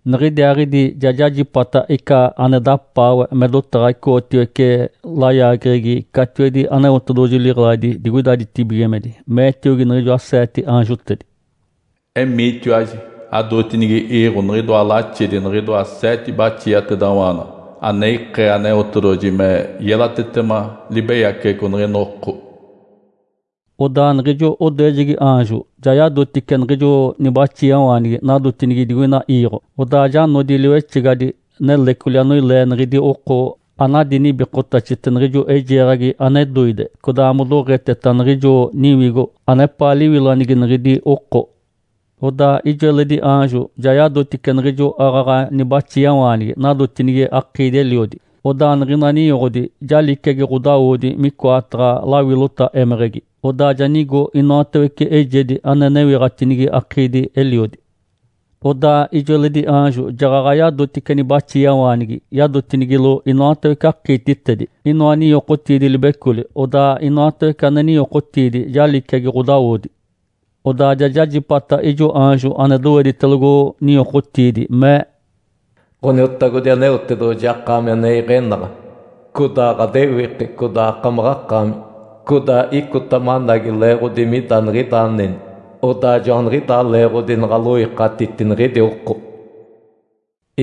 Niɡ̶idiaaɡ̶idi ja jajipata ica ane dapaawe me dotaɡ̶a icoɡ̶otiwece layaageɡ̶egi catiwedi Aneotedoɡ̶oji liɡ̶eladi digoida ditibigimedi, meetiogi niɡ̶ijoa seete aanjotedi, “Emiitiwaji adootinigi iiɡ̶o niɡ̶idoa laxedi niɡ̶idoa seete baxiatedawaanaɡ̶a, ane ikee Aneotedoɡ̶oji me yelatetema libeyaceɡ̶eco niɡ̶ina oko.” Odaa niɡ̶ijo odoejegi aanjo ja yadotice niɡ̶ijo nibaxiawaanigi nadotinigi digoina iiɡ̶o. Odaa ja nodi liwexegadi nelecoli anoilee niɡ̶idi oko anadi nibikotaxete niɡ̶ijo eijeeɡ̶agi ane doide, codaa modoɡ̶eteta niɡ̶ijo niwigo anepaa liwilanigi niɡ̶idi oko. Odaa ijo eledi aanjo ja yadotice niɡ̶ijo aaɡ̶aɡ̶a nibaxiawaanigi nadotinigi akiidi-eliodi. Odaa niɡ̶ina ninyoɡ̶odi ja liciagi ɡ̶odawodi micoataɡ̶a lawilota émeɡ̶egi, odaa ja nigo inoatawece eijedi ane newiɡ̶atinigi akiidi-eliodi. Odaa ijo eledi aanjo jaɡ̶aɡ̶a yadotice nibaxiawaanigi yadotinigilo inoatawece akiititedi, inoa ninyokotiidi libecoli, odaa inoatawece ane ninyokotiidi ja liciagi ɡ̶odawodi. Odaa ja jajipata ijo aanjo ane doweditelogo ninyokotiidi, mee, “Ǥoniotagodi Aneotedoɡ̶oji, akaami ane iɡ̶enaɡ̶a, codaa ɡ̶adewiki, codaa akaaɡ̶akaami, codaa icota managi, leeɡ̶odi mida niɡ̶ida aneni, odaa joaniɡ̶idaa leeɡ̶odi naɡ̶aloikatiti niɡ̶idi oko.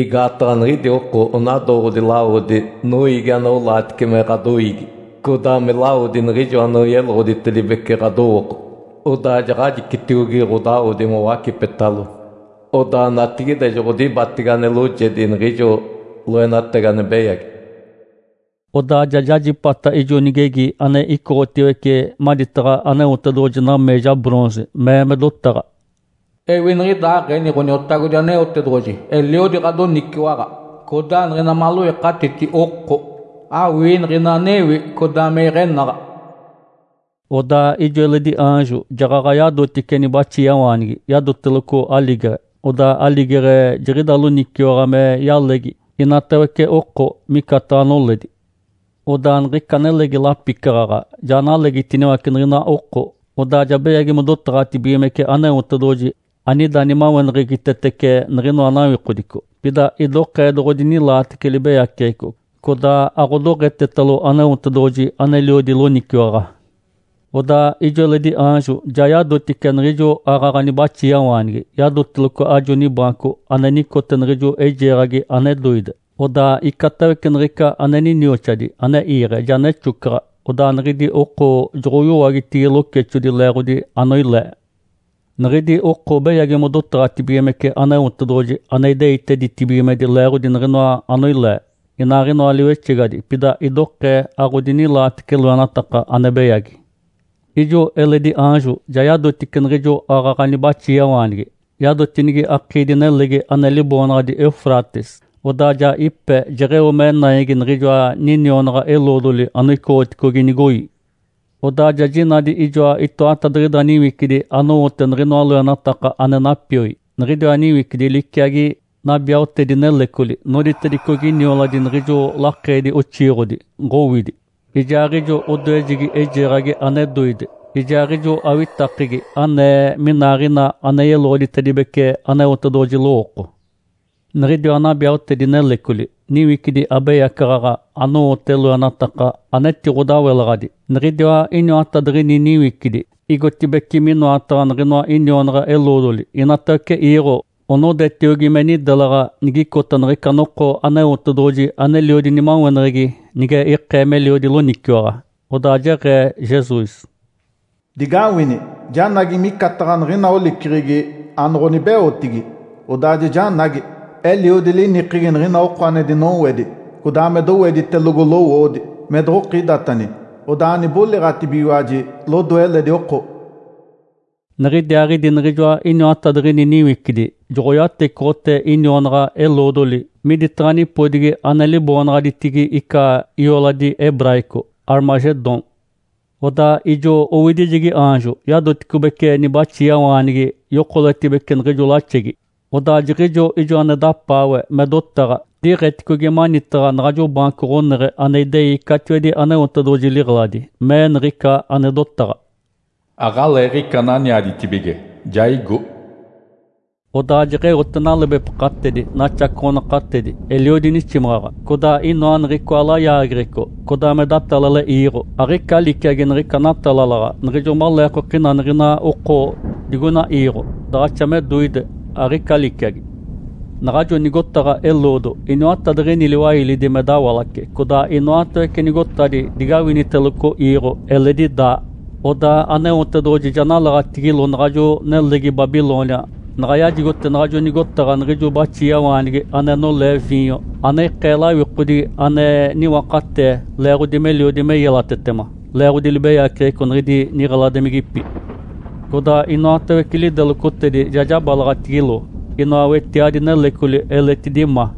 Igaataɡ̶a niɡ̶idi oko onadooɡ̶odi lawodi noiigi anaolaatice me ɡ̶adoiigi, codaa me lawodi niɡ̶ijo anoyeloɡ̶oditedibece ɡ̶adowooko. Odaa jaɡ̶ajicitiogi ɡ̶odawodi mowacipetalo. Odaa natigide joɡ̶odibatege ane loojedi niɡ̶ijo loenatagi ane beyagi.” Odaa ja jajipata ijo nigegi ane icoɡ̶otiwece maditaɡ̶a Aneotedoɡ̶oji nameeja bronze, mee me dotaɡ̶a, “Ewi niɡ̶idaaɡ̶eni Ǥoniotagodi Aneotedoɡ̶oji eliodi ɡ̶adoniciwaɡ̶a. Codaa niɡ̶ina maloikatiti oko, awii niɡ̶ina anewi codaa me iɡ̶enaɡ̶a.” Odaa ijo eledi aanjo jaɡ̶aɡ̶a yadotice nibaxiawaanigi, yadoteloco aligeɡ̶e. Odaa aligeɡ̶e jiɡ̶ida loniciwaɡ̶a me yalegi inatawece oko micataɡ̶a noledi. Odaa niɡ̶ica nelegi lapicaɡ̶aɡ̶a ja nalegitiniwace niɡ̶ina oko, odaa ja beyagi modotaɡ̶atibigimece Aneotedoɡ̶oji anida nimaweneɡ̶egitetece niɡ̶inoa nawikodico. Pida idokee doɡ̶odinilaatece libeyaceɡ̶eco, codaa aɡ̶odoɡ̶etetalo Aneotedoɡ̶oji aneliodi loniciwaɡ̶a. Odaa ijo eledi aanjo ja yadotice niɡ̶ijo aaɡ̶aɡ̶a nibaxiawaanigi, yadoteloco ajo nibaanco ane nicote niɡ̶ijo eijeeɡ̶agi ane doide. Odaa icatawece niɡ̶ica ane ninioxadi ane iiɡ̶e, ja nexocaɡ̶a. Odaa niɡ̶idi oko joɡ̶oyowagi locexodi leeɡ̶odi anoilee. Niɡ̶idi oko beyagi modotaɡ̶atibigimece Aneotedoɡ̶oji ane ideite ditibigimedi leeɡ̶odi niɡ̶inoa anoilee, inaaɡ̶inoa liwexegadi. Pida idokee aɡ̶odinilaatece loenataka ane beyagi. Ijo eledi aanjo ja yadotice niɡ̶ijo aaɡ̶aɡ̶a nibaxiawaanigi, yadotinigi akiidi-nelegi ane liboonaɡ̶adi Eufrates. Odaa ja ipe, jeɡ̶eo me naigi niɡ̶ijoa nionaɡ̶a-eloodoli anoicoɡ̶oticogi nigoi. Odaa ja jinadi ijoa itoatadiɡ̶ida niwicidi anowote niɡ̶inoa loenataka ane napioi. Niɡ̶idiwa niwicidi liciagi nabiaotedi-nelecoli noditedicogi nioladi niɡ̶ijo lakeedi-oxiiɡ̶odi “Ǥowidi”, ijaaɡ̶ijo odoejegi eijeeɡ̶agi ane doide, ijaaɡ̶ijo awitakegi anee minaaɡ̶ina ane yeloɡ̶oditedibece Aneotedoɡ̶oji lowooko. Niɡ̶idiwa nabiaotedi-nelecoli, niwicidi abeyacaɡ̶aɡ̶a anowote loenataka anetiɡ̶odawelaɡ̶adi. Niɡ̶idiwa iniwatadiɡ̶ini niwicidi igotibeci minoataɡ̶a niɡ̶inoa nionaɡ̶a-eloodoli inatawece iiɡ̶o onodetiogi me nidelaɡ̶a nigicota niɡ̶ica noko Aneotedoɡ̶oji aneliodi nimaweneɡ̶egi nige ikee meliodi loniciwaɡ̶a. Odaa jeɡ̶ee Jesus, “Digawini! Janagi micataɡ̶a niɡ̶ina oliceɡ̶egi anoɡ̶onibeotigi, odaa ja janagi. Eliodi linikegi niɡ̶ina oko ane dinowedi codaa me doweditelogo lowoodi, me doɡ̶okidatani, odaa aniboliɡ̶atibigiwaji lodoe eledi oko.” Niɡ̶idiaaɡ̶idi niɡ̶ijoa iniwatadiɡ̶ini niwicidi joɡ̶oyatecoɡ̶otee inionaɡ̶a-eloodoli miditaɡ̶a nipodigi ane liboonaɡ̶aditigi ica ioladi hebraico “Armagedom”. Odaa ijo owidijegi aanjo yadoticobece nibaxiawaanigi yokoletibece niɡ̶ijo laxegi. Odaa jiɡ̶ijo ijo ane dapaawe me dotaɡ̶a diiɡ̶eticogi manitaɡ̶a naɡ̶ajo baanco ɡ̶oneɡ̶e ane idei catiwedi Aneotedoɡ̶oji liɡ̶eladi, mee niɡ̶ica ane dotaɡ̶a, “Aɡ̶aleeɡ̶ica ananiaditibige, ja igo.” Odaa jeɡ̶eote nalebepakatedi, naxacoɡ̶onakatedi, eliodi niximaɡ̶aɡ̶a, codaa inoa niɡ̶icoa layaageɡ̶eco, codaa me datalale iiɡ̶o. Aɡ̶ica liciagi niɡ̶ica natalalaɡ̶a niɡ̶ijo maleekokina niɡ̶ina oko digoina iiɡ̶o. Daɡ̶axa me doide, aɡ̶ica liciagi. Naɡ̶ajo nigotaɡ̶a eloodo iniwatadiɡ̶ini liwailidi me dawalace, codaa inoatawece nigotadi digawiniteloco iiɡ̶o eletidi daa. Odaa Aneotedoɡ̶oji ja nalaɡ̶atigilo naɡ̶ajo nelegi Babilônia, naɡ̶a yajigote naɡ̶ajo nigotaɡ̶a niɡ̶ijo baxiawaanigi ane nolee viinyo ane ikee lawikodigi ane niwakatee leeɡ̶odi meliodi me yelatetema, leeɡ̶odi libeyaceɡ̶eco niɡ̶idi niɡ̶eladimigipi. Codaa inoatawece lidelocotedi ja jabalaɡ̶atigilo, inoa wetiadi nelecoli eletidi ma.